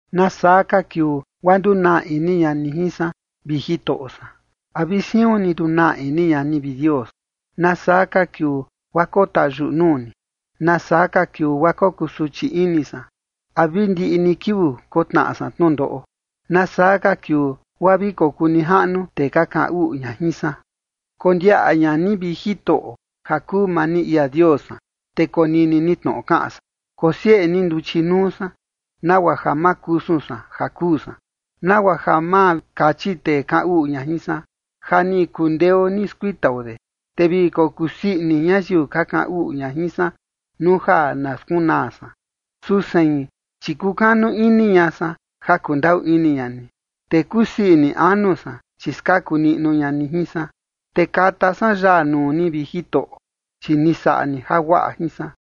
¿Nasaa ka kiuu guaa ndunaa ini ña ni jin san, vi Jitoꞌo san? ¿A vi siun ni ndunaa ini ña ni, vi Dios? ¿Nasaa ka kiuu guaa kotayuꞌu nuu ni? ¿Nasaa ka kiuu guaa kokusuchi ini san? ¿A vi ndiꞌi ni kiuu kotnaꞌa san tnundoꞌo? ¿Nasaa ka kiuu guaa vi kokuu nijaꞌnu tee ka kaꞌan uꞌu ña jin san? Kondiaꞌa ña ni, vi Jitoꞌo, ja kuu maa ni ia Dios san, te konini ni tnoꞌo kaꞌan san. Kosieꞌe ni nduchi nuu san, nagua ja ma kusun san ja kuu san, nagua ja ma kachi tee kaꞌan uꞌu ña jin san: “Ja ni kundeo ni skuitao de”, te vi kokusii ini ñayiu ka kaꞌan uꞌu ña jin san nuu ja na skunaa san. Su sein, chi kukanu ini ña san ja kundaꞌu ini ña ni, te kusii ini anu san, chi skaku niꞌnu ña ni jin san. Te kata san yaa nuu ni, vi Jitoꞌo, chi ni saꞌa ni jaguaꞌa jin san.